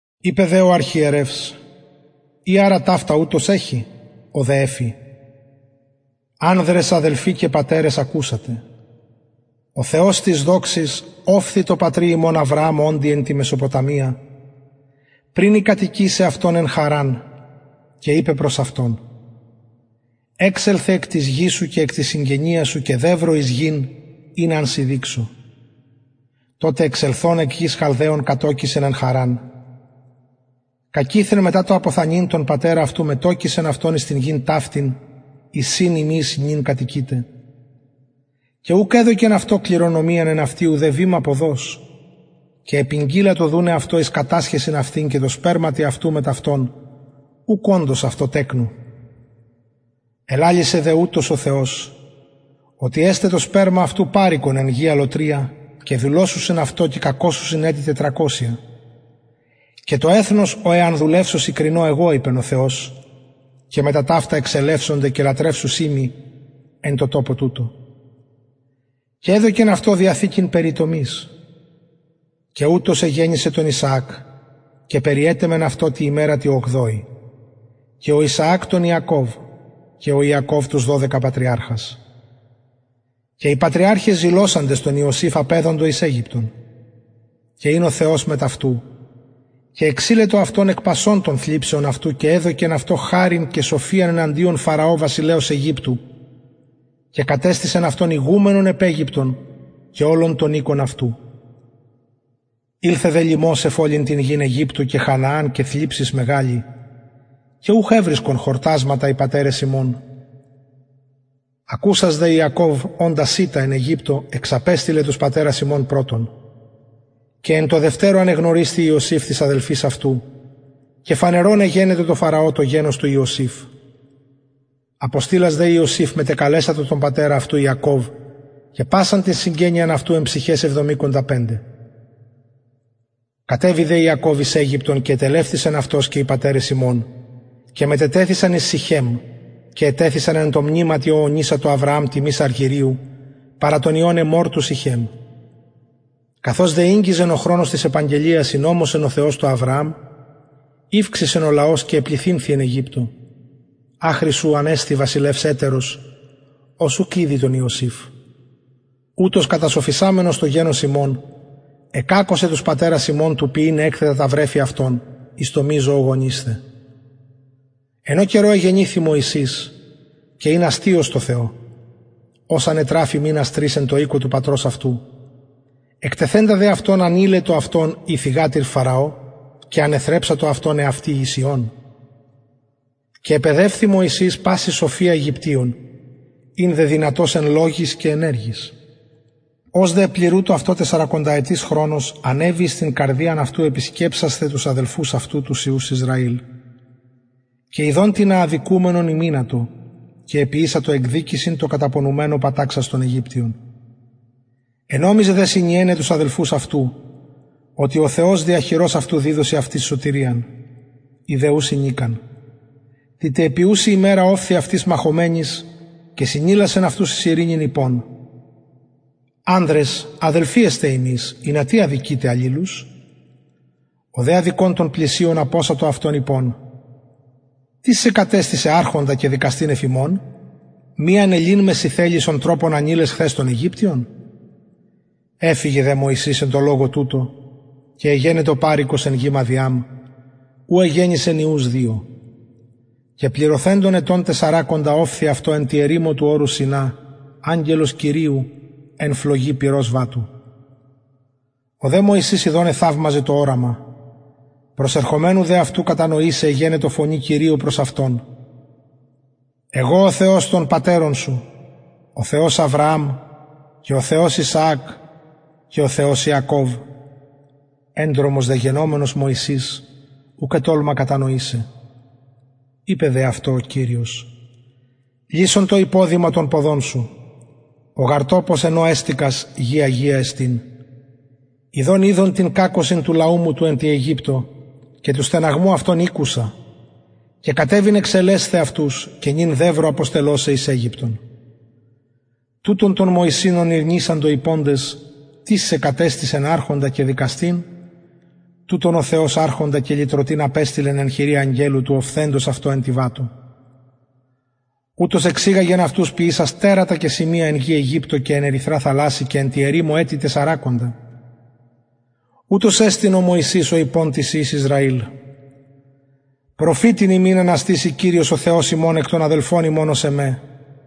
ειπεν δε ο αρχιερευς ει αρα ταυτα ουτως εχει ο δε εφη ανδρες αδελφοι και πατερες ακουσατε ο θεος της δοξης ωφθη τω πατρι ημων αβρααμ οντι εν τη μεσοποταμια πριν η κατοικησαι αυτον εν χαρραν και ειπεν προς αυτον εξελθε εκ της γης σου και εκ της συγγενειας σου και δευρο εις γην ην αν σοι δειξω τοτε εξελθων εκ γης χαλδαιων κατωκησεν εν χαρραν κακειθεν μετα το αποθανειν τον πατερα αυτου μετωκισεν αυτον εις την γην ταυτην εις ην υμεις νυν κατοικειτε και ουκ εδωκεν αυτω κληρονομιαν εν αυτη ουδε βημα ποδος και επηγγειλατο δουναι αυτω εις κατασχεσιν αυτην και τω σπερματι αυτου μετ αυτον ουκ οντος αυτω τεκνου ελαλησεν δε ουτως ο θεος οτι εσται το σπερμα αυτου παροικον εν γη αλλοτρια και δουλωσουσιν αυτο και κακωσουσιν ετη τετρακοσια και το εθνος ω εαν δουλευσωσιν κρινω εγω ειπεν ο θεος και μετα ταυτα εξελευσονται και λατρευσουσιν μοι εν τω τοπω τουτω και εδωκεν αυτω διαθηκην περιτομης και ουτως εγεννησεν τον ισαακ και περιετεμεν αυτον τη ημερα τη ογδοη και ο ισαακ τον ιακωβ και ο ιακωβ τους δωδεκα πατριαρχας και οι πατριαρχαι ζηλωσαντες τον ιωσηφ απεδοντο εις αιγυπτον και ην ο θεος μετ αυτου και εξειλετο αυτον εκ πασων των θλιψεων αυτου και εδωκεν αυτω χαριν και σοφιαν εναντιον φαραω βασιλεως αιγυπτου και κατεστησεν αυτον ηγουμενον επ αιγυπτον και ολον τον οικον αυτου ηλθεν δε λιμος εφ ολην την γην αιγυπτου και χανααν και θλιψις μεγαλη και ουχ ευρισκον χορτασματα οι πατερες ημων ακουσας δε ιακωβ οντα σιτα εν αιγυπτω εξαπεστειλεν τους πατερας ημων πρωτον και εν τω δευτερω ανεγνωρισθη ιωσηφ τοις αδελφοις αυτου και φανερον εγενετο τω φαραω το γενος του ιωσηφ αποστειλας δε ιωσηφ μετεκαλεσατο τον πατερα αυτου ιακωβ και πασαν την συγγενειαν εν ψυχαις εβδομηκοντα πεντε κατεβη δε ιακωβ εις αιγυπτον και ετελευτησεν αυτος και οι πατερες ημων και μετετεθησαν εις συχεμ και ετεθησαν εν τω μνηματι ο ωνησατο αβρααμ τιμης αργυριου παρα των υιων εμμορ του συχεμ καθως δε ηγγιζεν ο χρονος της επαγγελιας ης ωμοσεν ο θεος τω αβρααμ ηυξησεν ο λαος και επληθυνθη εν αιγυπτω αχρι ου ανεστη βασιλευς ετερος ος ουκ ηδει τον ιωσηφ ουτος κατασοφισαμενος το γενος ημων εκακωσεν τους πατερας ημων του ποιειν εκθετα τα βρεφη αυτων εις το μη ζωογονεισθαι εν ω καιρω εγεννηθη μωσης και ην αστειος τω θεω ος ανετραφη μηνας τρεις εν τω οικω του πατρος εκτεθεντα δε αυτον ανειλετο η θυγατηρ φαραω και ανεθρεψατο αυτον εαυτη εις υιον και επαιδευθη μωσης παση σοφια αιγυπτιων ην δε δυνατος εν λογοις και εργοις ως δε επληρουτο αυτω τεσσαρακονταετης χρονος ανεβη επι την καρδιαν αυτου επισκεψασθαι τους αδελφους αυτου τους υιους ισραηλ και ιδων τινα αδικουμενον ημυνατο και εποιησεν εκδικησιν τω καταπονουμενω παταξας τον αιγυπτιον ενομιζεν δε συνιεναι τους αδελφους αυτου οτι ο θεος δια χειρος αυτου διδωσιν αυτοις σωτηριαν οι δε ου συνηκαν τη τε επιουση ημερα ωφθη αυτοις μαχομενοις και συνηλασεν αυτους εις ειρηνην ειπων ανδρες αδελφοι εστε υμεις ινα τι αδικειτε αλληλους ο δε αδικων τον πλησιον απωσατο αυτον ειπων τις σε κατεστησεν αρχοντα και δικαστην εφ ημας μη ανελειν με συ θελεις ον τροπον ανειλες χθες τον αιγυπτιον εφυγεν δε μωσης εν τω λογω τουτω και εγενετο παροικος εν γη μαδιαμ ου εγεννησεν υιους δυο και πληρωθεντων ετων τεσσαρακοντα ωφθη αυτω εν τη ερημω του ορους σινα αγγελος κυριου εν φλογι πυρος βατου ο δε μωσης ιδων εθαυμαζεν το οραμα προσερχομενου δε αυτου κατανοησαι εγενετο φωνη κυριου προς αυτον εγω ο θεος των πατερων σου ο θεος αβρααμ και ο θεος ισαακ και ο θεος ιακωβ εντρομος δε γενομενος μωσης ουκ ετολμα κατανοησαι ειπεν δε αυτω ο κυριος λυσον το υποδημα των ποδων σου ο γαρ τοπος εν ω εστηκας γη αγια εστιν ιδων ειδον την κακωσιν του λαου μου του εν αιγυπτω και του στεναγμου αυτων ηκουσα και κατεβην εξελεσθαι αυτους και νυν δευρο αποστελω σε εις αιγυπτον τουτον τον μωσην ον ηρνησαντο ειποντες τις σε κατεστησεν αρχοντα και δικαστην τουτον ο θεος αρχοντα και λυτρωτην απεστειλεν εν χειρι αγγελου του οφθεντος αυτω εν τη βατω ουτος εξηγαγεν αυτους ποιησας τερατα και σημεια εν γη αιγυπτω και εν ερυθρα θαλασση και εν τη ερημω ετη τεσσαρακοντα ουτος εστιν ο μωσης ο ειπων τοις υιοις ισραηλ προφητην υμιν αναστησει κυριος ο θεος ημων εκ των αδελφων υμων ως εμε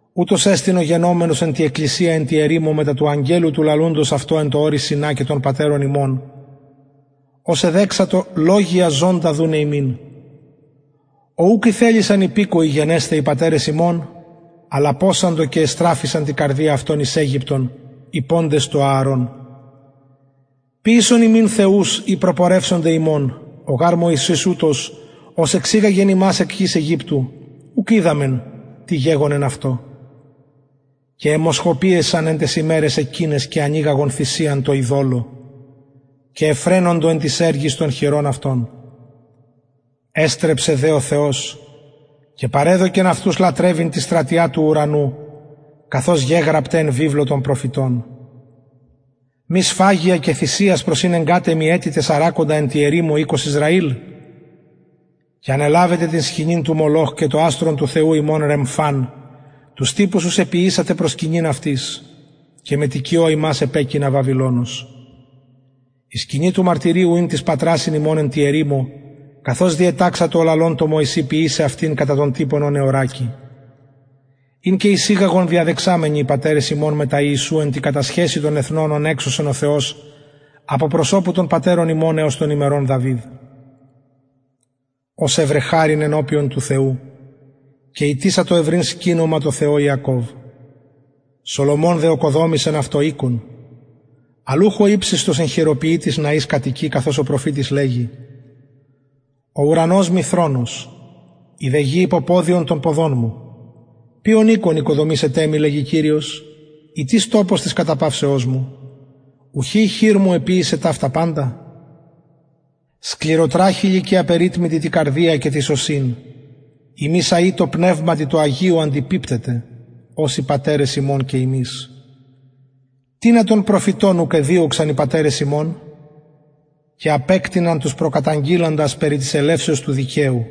ουτος εστιν ο γενομενος εν τη εκκλησια εν τη ερημω μετα του αγγελου του λαλουντος αυτω εν τω ορει σινα και των πατερων ημων ος εδεξατο λογον ζωντα δουναι ημιν ω ουκ ηθελησαν υπηκοοι γενεσθαι οι πατερες ημων αλλ απωσαντο και εστραφησαν τη καρδια αυτων εις αιγυπτον ειποντες τω ααρων ποιησον ημιν θεους οι προπορευσονται ημων ο γαρ μωσης ουτος ος εξηγαγεν ημας εκ γης αιγυπτου ουκ οιδαμεν τι γεγονεν αυτω και εμοσχοποιησαν εν ταις ημεραις εκειναις και ανηγαγον θυσιαν τω ειδωλω και ευφραινοντο εν τοις εργοις των χειρων αυτων εστρεψεν δε ο θεος και παρεδωκεν αυτους λατρευειν τη στρατια του ουρανου καθως γεγραπται εν βιβλω των προφητων μη σφαγια και θυσιας προσηνεγκατε μοι ετη τεσσαρακοντα εν τη ερημω οικος ισραηλ και ανελαβετε την σκηνην του μολοχ και το αστρον του θεου υμων ρεμφαν τους τυπους ους εποιησατε προσκυνειν αυτοις και μετοικιω υμας επεκεινα βαβυλωνος η σκηνη του μαρτυριου ην τοις πατρασιν ημων εν τη ερημω καθως διεταξατο ο λαλων τω μωση ποιησαι αυτην κατα τον τυπον ον εωρακει ην και εισηγαγον διαδεξαμενοι οι πατερες ημων μετα ιησου εν τη κατασχεσει των εθνων ων εξωσεν ο θεος απο προσωπου των πατερων ημων εως των ημερων δαυιδ ος ευρεν χαριν ενωπιον του θεου και ητησατο ευρειν σκηνωμα τω θεω ιακωβ σολομων δε ωκοδομησεν αυτω οικον αλλ ουχ ο υψιστος εν χειροποιητοις ναοις κατοικει καθως ο προφητης λεγει ο ουρανος μοι θρονος η δε γη υποποδιον των ποδων μου ποιον οικον οικοδομησετε μοι λεγει κυριος η τις τοπος της καταπαυσεως μου ουχι η χειρ μου εποιησεν ταυτα παντα σκληροτραχηλοι και απεριτμητοι τη καρδια και τοις ωσιν υμεις αει τω πνευματι τω αγιω αντιπιπτετε ως οι πατερες υμων και υμεις τινα των προφητων ουκ εδιωξαν οι πατερες υμων και απεκτειναν τους προκαταγγειλαντας περι της ελευσεως του δικαιου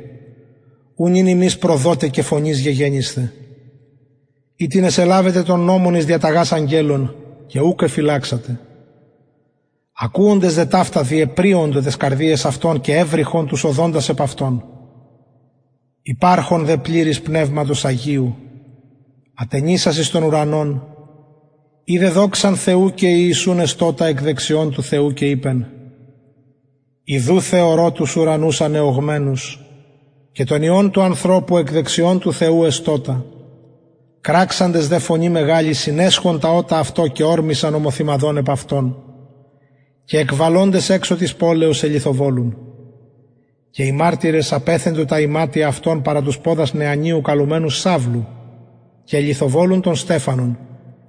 ου νυν υμεις προδοται και φονεις γεγενησθε οιτινες ελαβετε τον νομον εις διαταγας αγγελων και ουκ εφυλαξατε ακουοντες δε ταυτα διεπριοντο ταις καρδιαις αυτων και εβρυχον τους οδοντας επ αυτον υπαρχων δε πληρης πνευματος αγιου ατενισας εις τον ουρανον ειδεν δοξαν θεου και ιησουν εστωτα εκ δεξιων του θεου και ειπεν ιδου θεωρω τους ουρανους ανεωγμενους και τον υιον του ανθρωπου εκ δεξιων εστωτα του θεου κραξαντες δε φωνη μεγαλη συνεσχον τα ωτα αυτων και ωρμησαν ομοθυμαδον επ αυτον και εκβαλοντες εξω της πολεως ελιθοβολουν και οι μαρτυρες απεθεντο τα ιματια παρα τους ποδας νεανιου καλουμενου σαυλου και ελιθοβολουν τον στεφανον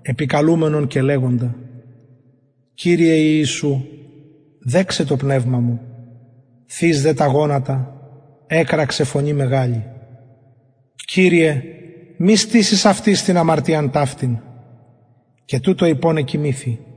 επικαλουμενον και λεγοντα κυριε ιησου δεξαι το πνευμα μου θεις δε τα γονατα εκραξεν φωνη μεγαλη κυριε μη στησης αυτοις την αμαρτιαν ταυτην και τουτο ειπων εκοιμηθη